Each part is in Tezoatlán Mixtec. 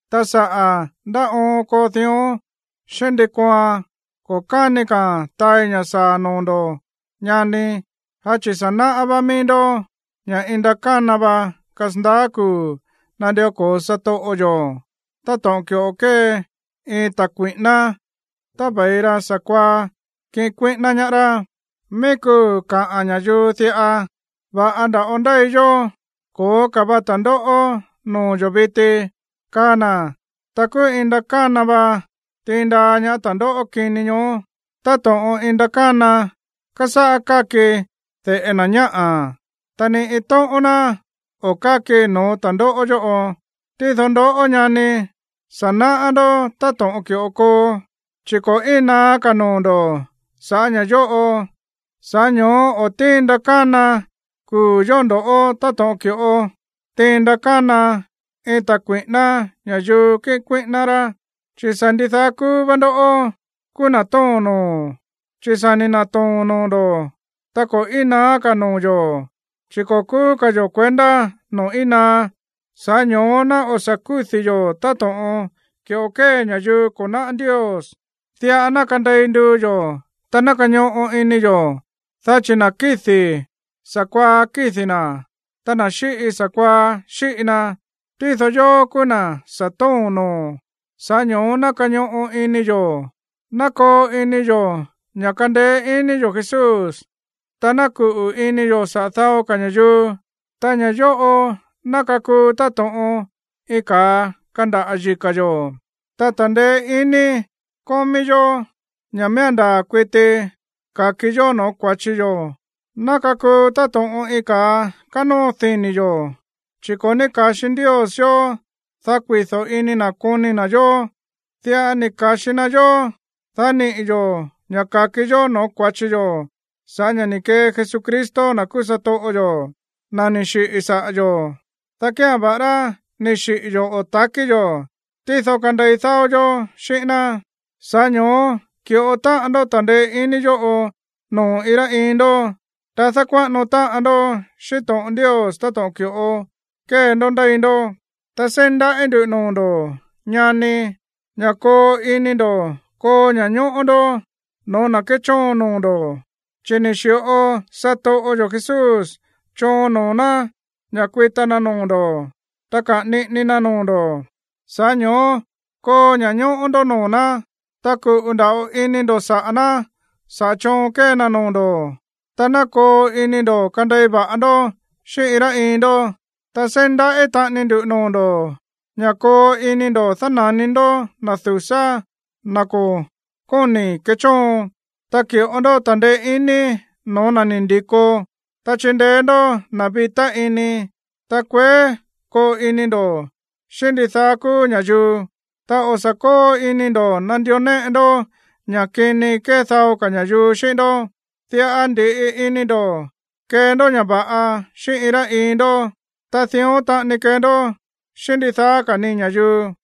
Ta saꞌa̱ ndá oon koo dión xíꞌín ndi kooan, ko̱ káni ka̱a̱n taai ña̱ saa̱ noo̱ ndo̱, ñani, dá chi̱ sa̱ náꞌá va̱ꞌa mií ndó ña̱ iin ndakána va kasandaá kuu̱ nandió ko̱o satoꞌo yo̱, táto̱ꞌon ki̱ꞌo kée iin ta̱ kui̱ꞌíná tá ve̱i ra sa̱kuaá kiꞌin kuíꞌíná ñaá rá. Mií kuu̱ kaꞌa̱n ña̱yuu diꞌa: “Va̱ꞌa nda̱ꞌo ndéi yó, ko̱ó ka̱ va ta̱ndóꞌó noo̱ yo̱ viti”, kaa na̱, ta kúú iin ndakána va tiin ñaá ta̱ndóꞌó kini ñoó, táto̱ꞌon iin ndakána kásáꞌá káki de̱ꞌe na̱ ñáꞌa̱. Ta ni iin tóꞌón ná o̱ káki no̱ó ta̱ndóꞌó yóꞌo. Tído ndoꞌó, ñani, sa̱ náꞌá ndó táto̱ꞌon ki̱ꞌo koo, chi̱ ko̱ íin naá ka̱ noo̱ ndo̱ sa̱ꞌá ña̱ yóꞌo. Sa̱ꞌá ño̱ó o̱ tíin ndakána kuu̱ yóꞌo ndo̱ꞌó táto̱ꞌon ki̱ꞌo tíin ndakána iin ta̱ kui̱ꞌíná ña̱yuu kiꞌin kuíꞌíná rá. Chi̱ sa̱ ndidaá kúú vá ndoꞌó kúú na̱ tóo̱n noo̱, chi̱ sa̱ ni̱ na̱too̱n noo̱ ndo̱. Ta ko̱ íin naá ka̱ noo̱ yo̱, chi̱ ko̱ kúú ka̱ yo̱ kuendá noo̱ íin naá. Sa̱ꞌá ño̱ó ná o̱ sa̱ kúdi̱ yo̱ táto̱ꞌon ki̱ꞌo kée ña̱yuu ko̱ náꞌá Ndios. Diꞌa ná kandei nduu yo̱, ta ná kañoꞌo ini yo̱. Dá chi̱ na̱ kídi̱, sa̱kuaá kídi̱ na̱, ta na̱ xíꞌi, sa̱kuaá xíꞌi na. Tído yóó kúú na̱ sa̱ tóo̱n noo̱, sa̱ꞌá ño̱ó ná kañoꞌo ini yo̱. Ná koo ini yo̱ ña̱ kandeé iní yo̱ Jesús, ta ná kuꞌu̱ ini yo̱ saꞌa̱ dao ka̱ ña̱yuu. Ta ña̱ yóꞌo ná kakuu táto̱ꞌon iin ka̱a kandaꞌa̱ yika̱ yo̱. Ta ta̱ndeé iní kómí yó ña̱ miía̱n ndaa̱ kuití ka̱ki yó no̱ó kua̱chi yo̱ ná kakuu táto̱ꞌon iin ka̱a kanóo dini̱ yo̱. Chi̱ ko̱ ní ka̱xi Ndios yó, dá kuido̱ ini na̱ koni na̱ yó. Diꞌa ni̱ ka̱xi na yó, dá niꞌi̱ yo̱ ña̱ ka̱ki yó no̱ó kua̱chi yo̱ sa̱ꞌá ña̱ ni̱ kee Jesucristo, na̱ kúú satoꞌo yo̱, na̱ ni̱ xiꞌi̱ saꞌa̱ yo̱, dá kía̱n, va̱ꞌará ni̱ xiꞌi̱ yo̱ o takí yo̱, tído kandei dáó yó xíꞌín ná. Sa̱ꞌá ño̱ó ki̱ꞌo táꞌan ndó ta̱ndeé iní yóꞌo noo̱ iin rá iin ndó, ta dákuáꞌano táꞌan ndó xíꞌín to̱ꞌon Ndios táto̱ꞌon ki̱ꞌo kée ndó ndéi ndó. Ta seí ndaꞌí ndu̱ noo̱ ndo̱, ñani, ña̱ koo ini ndo̱ koo ña̱ñóꞌó ndó no̱ó na̱ kéchóon noo̱ ndo̱, chi̱ ni̱ xi̱ꞌo satoꞌo yo̱ Jesús choon noo̱ ná ña̱ kuita na noo̱ ndo̱, ta kaꞌa̱n niꞌini na noo̱ ndo̱. Sa̱ꞌá ño̱ó koo ña̱ñóꞌó ndó noo̱ ná, ta kuꞌu̱ nda̱ꞌo ini ndo̱ saꞌa̱ ná saꞌa̱ choon kée na noo̱ ndo̱. Ta ná koo ini ndo̱ kandei va̱ꞌa ndó xíꞌín iin rá iin ndó. Ta seí ndaꞌí taꞌani ndu noo̱ ndo̱ ña̱ koo ini ndo̱ dána̱ni ndó na̱ du̱sá, na̱ ko̱ kóni̱ kechóon. Ta ki̱ꞌo ndó ta̱ndeé iní no̱ó na̱ ni̱ ndi̱ko, ta chindeé ndó na̱ vitá ini. Ta kueé koo ini ndo̱ xíꞌín ndidaá kúú ña̱yuu. Ta o̱ sa̱ kóo ini ndo̱ nandió néꞌe ndó ña̱ kini kée dao ka̱ ña̱yuu xíꞌín ndó. Diꞌa ndi̱ꞌi ini ndo̱ kee ndó ña̱ va̱ꞌa xíꞌín iin rá iin ndó. Ta dión taꞌani kee ndó xíꞌín ndidaá ka̱ ni ña̱yuu.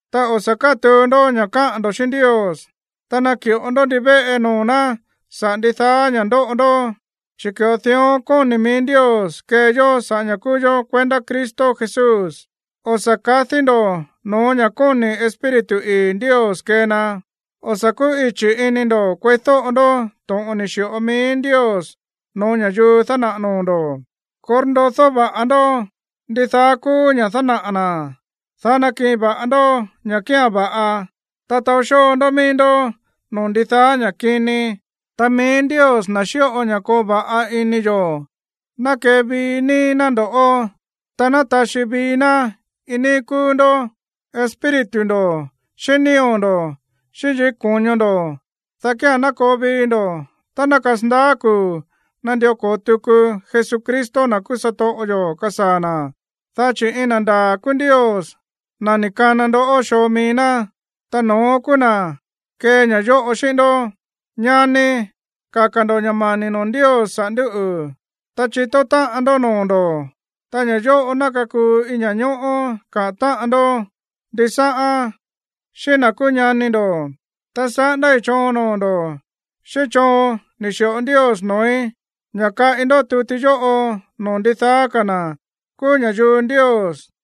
Ta o̱ sa̱ kátuu ndó ña̱ káꞌa̱n ndo̱ xíꞌín Ndios. Ta naki̱ꞌo ndó ndivéꞌe noo̱ ná saꞌa̱ ndidaá ña̱ ndóꞌo ndó, chi̱ ki̱ꞌo dión kóni̱ mií Ndios kee yó sa̱ꞌá ña̱ kúú yó kuendá Cristo Jesús. O̱ sa̱ kadí ndo̱ no̱ó ña̱ kóni̱ Espíritu ii̱ Ndios kee na. O̱ sa̱ kúꞌichi̱ ini ndo̱ kueídóꞌo ndó to̱ꞌon ni̱ xi̱ꞌo mií Ndios no̱ó ña̱yuu dánaꞌa̱ noo̱ ndo̱. Korndodó va̱ꞌa ndó ndidaá kúú ña̱ dánaꞌa̱ na̱, dá nakiꞌin va̱ꞌa ndó ña̱ kía̱n va̱ꞌa. Ta taó xóo ndó mií ndó no̱ó ndidaá ña̱ kini. Ta mií Ndios, na̱ xíꞌo ña̱ koo va̱ꞌa ini yo̱, ná kevii níi ná ndo̱ꞌó, ta ná taxí vii ná iin níí kúú ndó, espíritu ndo̱, xíꞌín nío̱ ndo̱, xíꞌín yikí ko̱ño ndo̱, dá kía̱n ná koo vii ndo̱ tá ná kasandaá kuu̱ nandió ko̱o tuku Jesucristo, na̱ kúú satoꞌo yo̱, kasaa̱ na̱. Dá chi̱ iin na̱ ndaa̱ kúú Ndios, na̱ ni̱ kana ndoꞌó xoo mií ná, ta no̱ón kúú na̱ kee ña̱ yóꞌo xíꞌín ndó. Ñani, kaka̱ ndo̱ ña̱ mani̱ noo̱ Ndios saꞌa̱ ndúꞌu̱. Ta chitó táꞌan ndó noo̱ ndo̱, ta ña̱ yóꞌo ná kakuu iin ña̱ñóꞌó kaꞌa̱n táꞌan ndó ndisáꞌán xíꞌín na̱ kúú ñani ndo̱. Ta saꞌándái̱ choon noo̱ ndo̱ xíꞌín choon ni̱ xi̱ꞌo Ndios noo̱í ña̱ kaꞌi ndó tuti yóꞌo noo̱ ndidaá ka̱ na̱ kúú ña̱yuu Ndios.